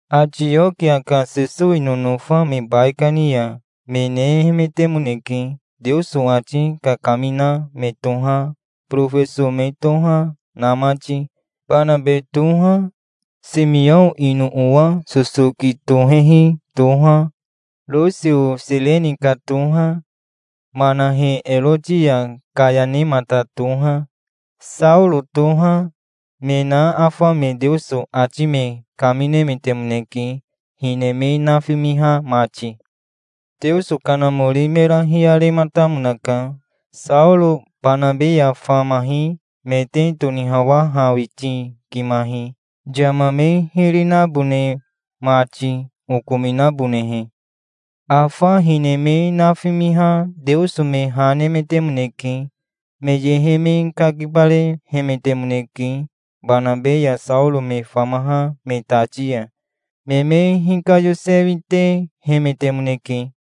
Atiokia ka Sesowi nonofa me baikani ya me nehemetemoneke, Teoso ati kakamina me toha, borofeso me toha, na mati. Banabe toha, Simiao ino owa sosoki tohehi toha, Rosio Sireni ka toha, Manahe Eroti ya kayanemata toha, Saoro toha, me na afa me Teoso ati me kaminemetemoneke, hine me nafimiha mati. Teoso Kanamori mera hiyarematamonaka. "Saoro Banabe ya famahi me te tonihawahawitikimahi, yama me hiri nabone mati, okominabonehe". Afa hine me nafimiha Teoso me ha nemetemoneke. Me yehe me kakibarehemetemoneke, Banabe ya Saoro me famaha me tati ya. Me me hikayosewitehemetemoneke.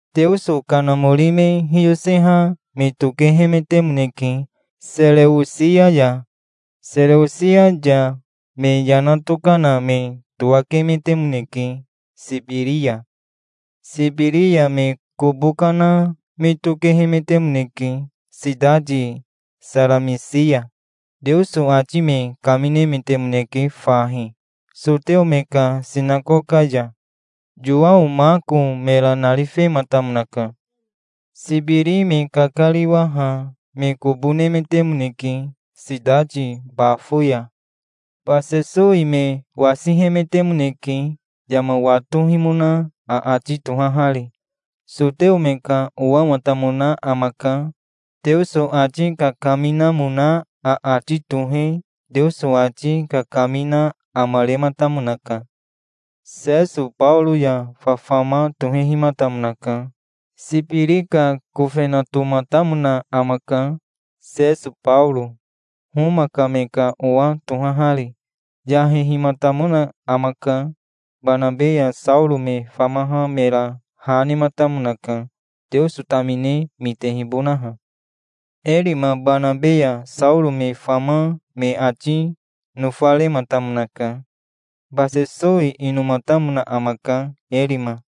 Teoso Kanamori me hiyoseha me tokehemetemoneke Sereosia ya. Sereosia ya me yana tokana me towakemetemoneke Sibiri ya. Sibiri ya me kobo kana me tokehemetemoneke sitati Saramisi ya. Teoso ati me kaminemetemoneke fahi, soteo me ka sinakoka ya. Yowao Mako mera narifematamonaka. Sibiri me kakariwaha me kobo nemetemoneke sitati Bafo ya. Basesowi me wasihemetemoneke, yama watohimona aati tohahari. Soteo me ka owamatamona amaka. Teoso ati kakaminamona aati tohe Teoso ati kakamina amarematamonaka. Seso Baoro ya fafama tohehimatamonaka. Sibiri ka kofenatomatamona amaka, Seso Baoro, Homa ka me ka owa tohahari. Yahehimatamona amaka. Banabe ya Saoro me famaha mera ha nematamonaka, Teoso tamine mitehibonaha. Erima Banabe ya Saoro me fama me ati nofarematamonaka. Basesowi inomatamona amaka, Erima,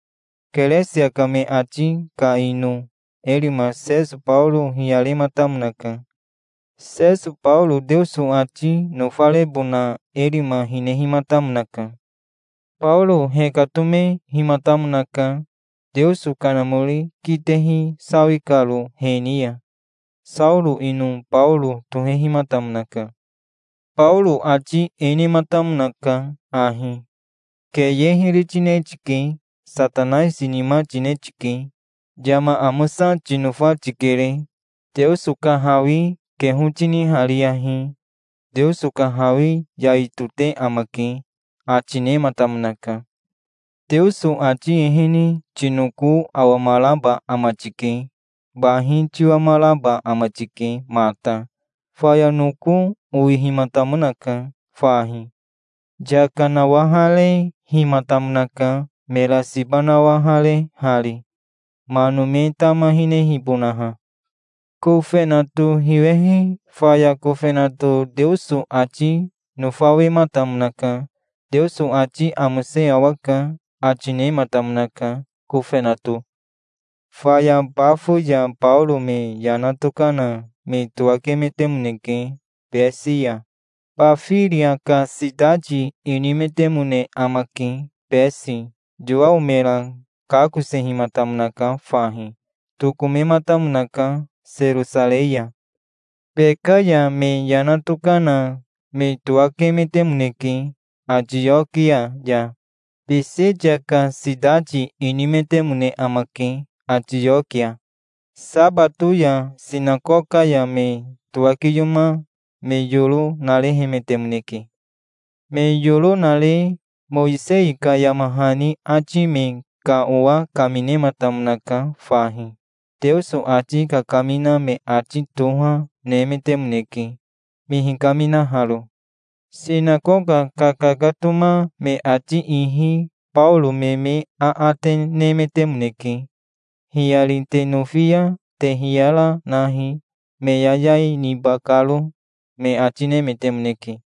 Keresia ka me ati ka ino. Erima Seso Baoro hiyarematamonaka. Seso Baoro Teoso ati nofarebona Erima hinehimatamonaka. Baoro hekatomehimatamonaka, Teoso Kanamori kitehi sawi karo he ni ya. Saoro ino Baoro tohehimatamonaka. Baoro ati e nematamonaka ahi. "Keye hiri tine tike. Satanaisi nima tine tike. Yama amosa tinofa tikere. Teoso ka hawi keho tinihariyahi. Teoso ka hawi yai tote amake", ati nematamonaka. "Teoso ati ehene tinoko awamaraba ama tike. Bahi tiwamaraba ama tike mata". Faya noko owihimatamonaka fahi. Yaka nawaharehimatamonaka, mera siba nawaharehari, mano me tama hinehibonaha. Kofenato hiwehi faya kofenato Teoso ati nofawematamonaka. "Teoso ati amose awaka", ati nematamonaka, kofenato. Faya Bafo ya Baoro me yana tokana me towakemetemoneke Besi ya. Bafiria ka sitati inimetemone amake, Besi. Yowao mera kakosehimatamonaka fahi. Tokomematamonaka Serosarei ya. Beka ya me yana tokana me towakemetemoneke Atiokia ya. Bisitia ka sitati inimetemone amake, Atiokia. Sabato ya sinakoka ya me towakiyoma me yoro narehemetemoneke. Me yoro nare Mowisei ka yama hani ati me ka owa kaminematamonaka fahi. Teoso ati kakamina me ati toha, nemetemoneke, me hikaminaharo. Sinakoka kakakatoma me ati ihi Baoro me me aate nemetemoneke. "Hiyari te nofi ya te hiyara nahi, me yayai niba karo", me ati nemetemoneke.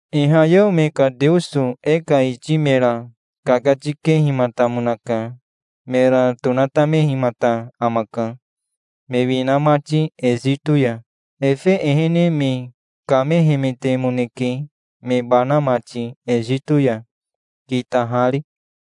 Ihayeo me ka Teoso e ka iti mera kakatikehimatamonaka. Mera tonatamehimata amaka, me wina mati Esito ya. Efe ehene me kamehemetemoneke, me bana mati Esito ya, kitahari.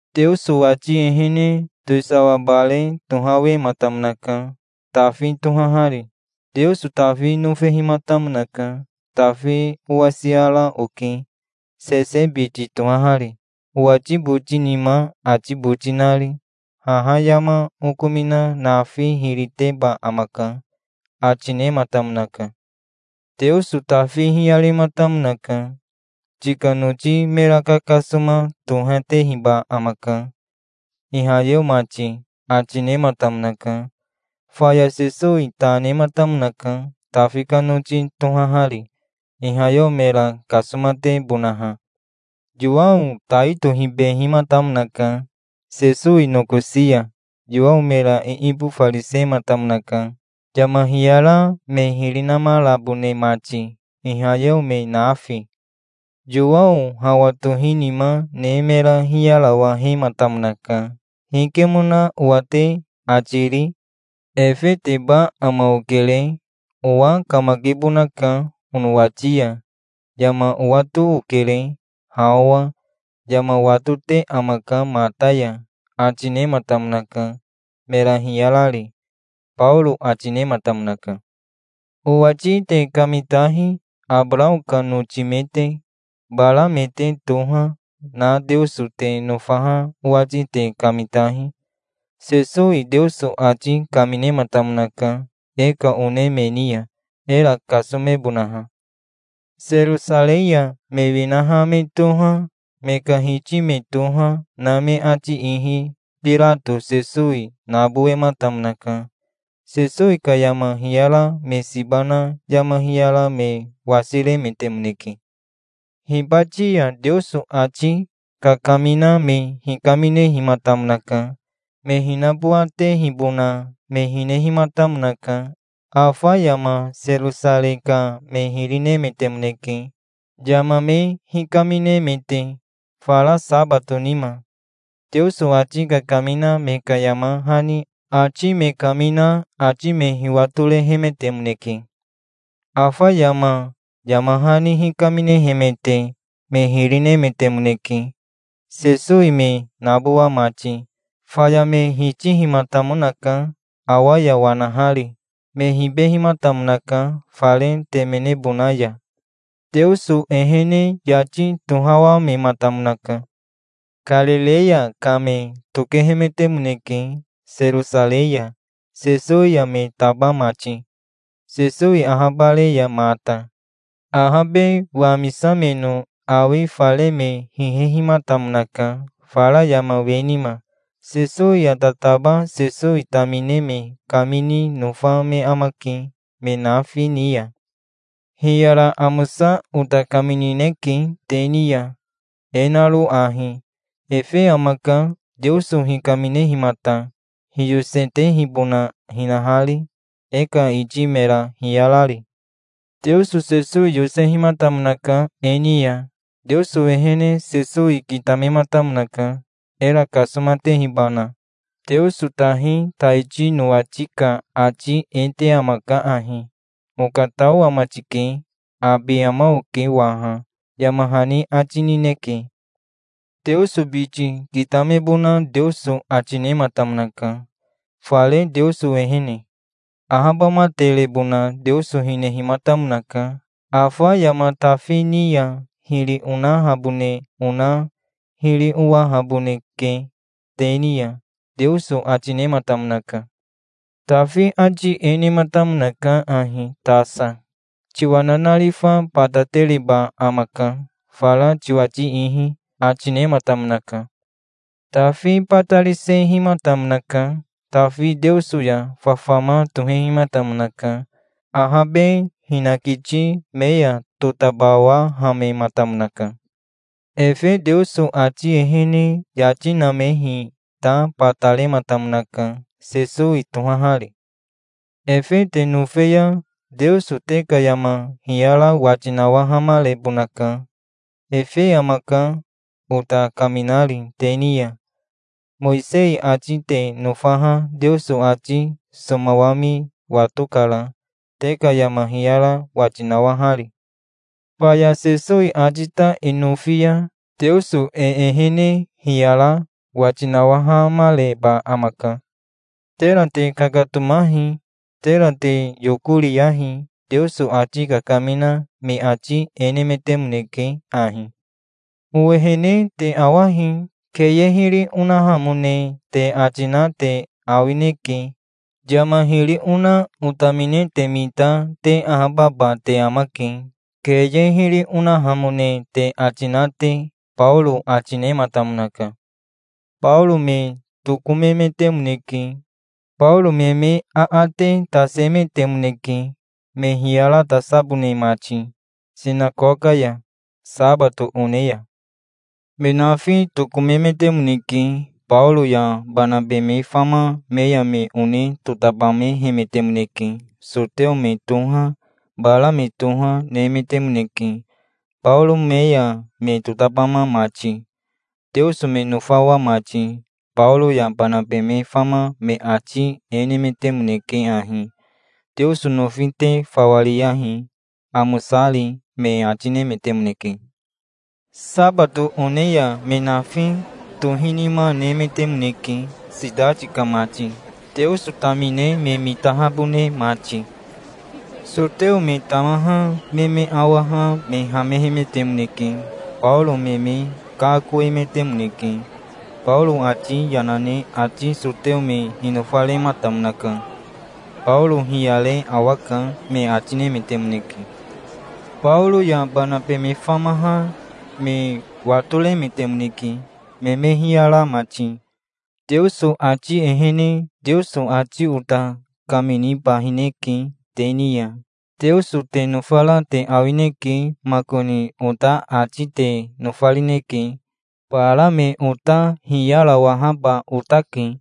Teoso ati ehene towisawa bare tohawematamonaka, Tafi tohahari. Teoso Tafi nofehimatamonaka. 'Tafi owasiara oke, Sese biti tohahari, owati boti nima ati boti nari. Haha yama okomina nafi hiri teba amaka', ati nematamonaka". "Teoso Tafi hiyarematamonaka. 'Tika noti me kakasoma tohatehiba amaka, ihayeo mati', ati nematamonaka. Faya Sesowi ta nematamonaka, Tafi ka noti tohahari, ihayeo mera kasomatebonaha". "Yowao tai tohibehimatamonaka, Sesowi nokosi ya. Yowao mera iibofarisematamonaka, yama hiyara me hiri namarabone mati, ihayeo me nafi. Yowao hawa tohinima ne mera hiyarawahematamonaka. 'Hikemona owa te ati ri? Efeteba ama okere. E ka owa kamakibonaka onowati ya. Yama owato okere, ha owa. Yama watote amaka mata ya', ati nematamonaka, mera hiyarari", Baoro ati nematamonaka. "Owati te kamitahi, Abarao ka noti me te. Bara me te toha, na Teoso te nofaha owati te kamitahi. Sesowi Teoso ati kaminematamonaka e ka one me ni ya, era kasomebonaha. Serosarei ya me winaha me toha, me ka hiti me toha, na me ati ihi Birato Sesowi nabowematamonaka. Sesowi ka yama hiyara me siba na yama hiyara me wasiremetemoneke. Hibati ya Teoso ati kakamina me hikaminehimatamonaka. Me hinabowatehibona me hinehimatamonaka. Afa yama Serosarei ka me hiri nemetemoneke, yama me hikaminemete. Fara sabato nima Teoso ati kakamina me ka yama hani ati me kamina ati me hiwatorehemetemoneke. Afa yama yama hani hikaminehemete me hiri nemetemoneke, Sesowi me nabowa mati. Faya me hitihimatamonaka, awa ya wanahari. Me hibehimatamonaka fare temenebona ya. Teoso ehene yati tohawamematamonaka". "Karireya ka me tokehemetemoneke, Serosarei ya Sesowi ya me taba mati, Sesowi ahabare ya mata. Ahabe wamisameno awi fare me hihehimatamonaka, fara yama we nima. Sesowi ya tataba Sesowi tamine me kamini nofa me amake me nafi ni ya. Hiyara amosa ota kaminineke te ni ya, e naro ahi: Efe amaka, Teoso hikaminehimata, hiyosetehibona hinahari, e ka iti mera hiyarari. Teoso Sesowi yosehimatamonaka e ni ya. Teoso ehene Sesowi kitamematamonaka, era kasomatehibana. Teoso tahi taiti nowati ka ati e te amaka ahi: 'Okatao ama tike. Abi ama oke waha', yama hani ati nineke. Teoso biti kitamebona Teoso ati nematamonaka, fare Teoso ehene. Ahabamaterebona Teoso hinehimatamonaka. 'Afa yama Tafi ni ya hiri onahabone ona hiri owahaboneke te ni ya', Teoso ati nematamonaka. Tafi ati e nematamonaka ahi tasa. 'Tiwa nanarifa batatereba amaka, fara tiwati ihi', ati nematamonaka. Tafi batarisehimatamonaka. Tafi Teoso ya fafama tohehimatamonaka. Ahabe hinakiti me ya totabawahamematamonaka. Efe Teoso ati ehene yati namehi ta batarematamonaka, Sesowi tohahari. Efe te nofe ya Teoso te ka yama hiyara wati nawahamarebonaka. Efe amaka, ota kaminari te ni ya. Mowisei ati te nofaha Teoso ati somawami watokara, te ka yama hiyara wati nawahari. Faya Sesowi ati ta e nofi ya Teoso e ehene hiyara wati nawahamareba amaka. Tera te kakatomahi. Tera te yokoriyahi. Teoso ati kakamina me ati e nemetemoneke ahi: 'Owehene te awahi. Keye hiri onahamone te ati na te awineke. Yama hiri ona otamine te mita te ahababa te amake, keye hiri onahamone te ati na te'", Baoro ati nematamonaka. Baoro me tokomemetemoneke. Baoro me me aate tasemetemoneke, me hiyaratasabone mati sinakoka ya, sabato one ya. Me nafi tokomemetemoneke. Baoro ya Banabe me fama me ya me one totabamehemetemoneke. Soteo me toha, bara me toha, nemetemoneke, Baoro me ya me totabama mati, Teoso me nofawa mati. Baoro ya Banabe me fama me ati e nemetemoneke ahi: "Teoso nofi te fawa riyahi, amosari", me ati nemetemoneke. Sabato one ya me nafi tohinima nemetemoneke, sitati ka mati, Teoso tamine me mitahabone mati. Soteo me tamaha me me awaha me hamehemetemoneke. Baoro me me kakoemetemoneke. Baoro ati yana ne ati soteo me hinofarematamonaka. "Baoro hiyare awaka", me ati nemetemoneke. Baoro ya Banabe me famaha me watoremetemoneke, me me hiyara mati. "Teoso ati ehene Teoso ati ota kaminibahineke te ni ya. Teoso te nofara te awineke makoni ota ati te nofarineke. Bara me ota hiyarawahaba otake.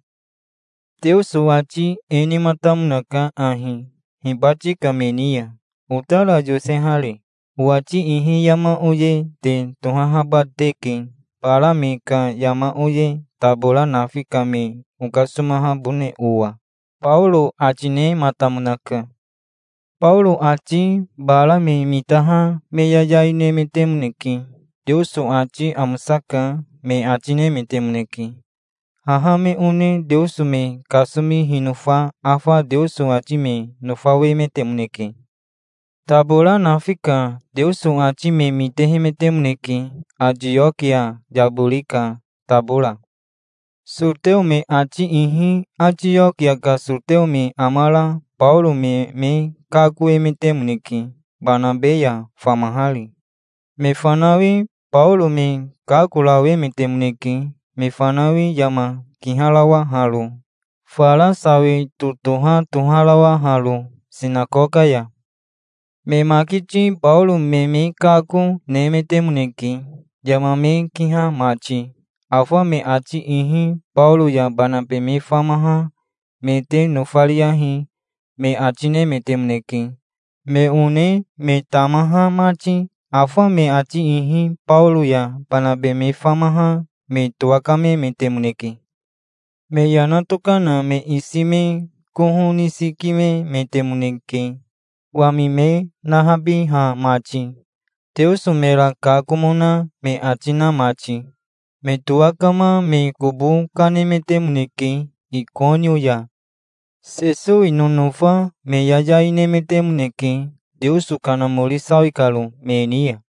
Teoso ati e nematamonaka ahi, hibati ka me ni ya, otara yosehari: 'Owati ihi yama oye te tohahaba teke, bara me ka yama oye, tabora nafi ka me okasomahabone owa'", Baoro ati nematamonaka. Baoro ati bara me mitaha me yayai nemetemoneke. "Teoso ati amosaka", me ati nemetemoneke. Haha me one Teoso me kasomi hinofa afa Teoso ati me nofawemetemoneke. Tabora nafi ka Teoso ati me mitehemetemoneke, Atiokia yabori ka tabora. Soteo me ati ihi Atiokia ka soteo me amara Baoro me me kakoemetemoneke, Banabe ya famahari. Me fanawi Baoro me kakorawemetemoneke, me fanawi yama kiharawaharo, fara sawi totoha toharawaharo sinakoka ya. Me makiti Baoro me me kako, nemetemoneke, yama me kiha mati. Afa me ati ihi "Baoro ya Banabe me famaha me te nofariyahi", me ati, nemetemoneke, me one, me tamaha mati. Afa me ati ihi Baoro ya Banabe me famaha me towakamemetemoneke. Me yana tokana me isi me koho nisikimemetemoneke, wami me nahabiha mati, Teoso mera kakomona me ati na mati. Me towakama me kobo kanemetemoneke Ikonio ya. Sesowi nonofa me yayai nemetemoneke, Teoso Kanamori sawi karo me ni ya.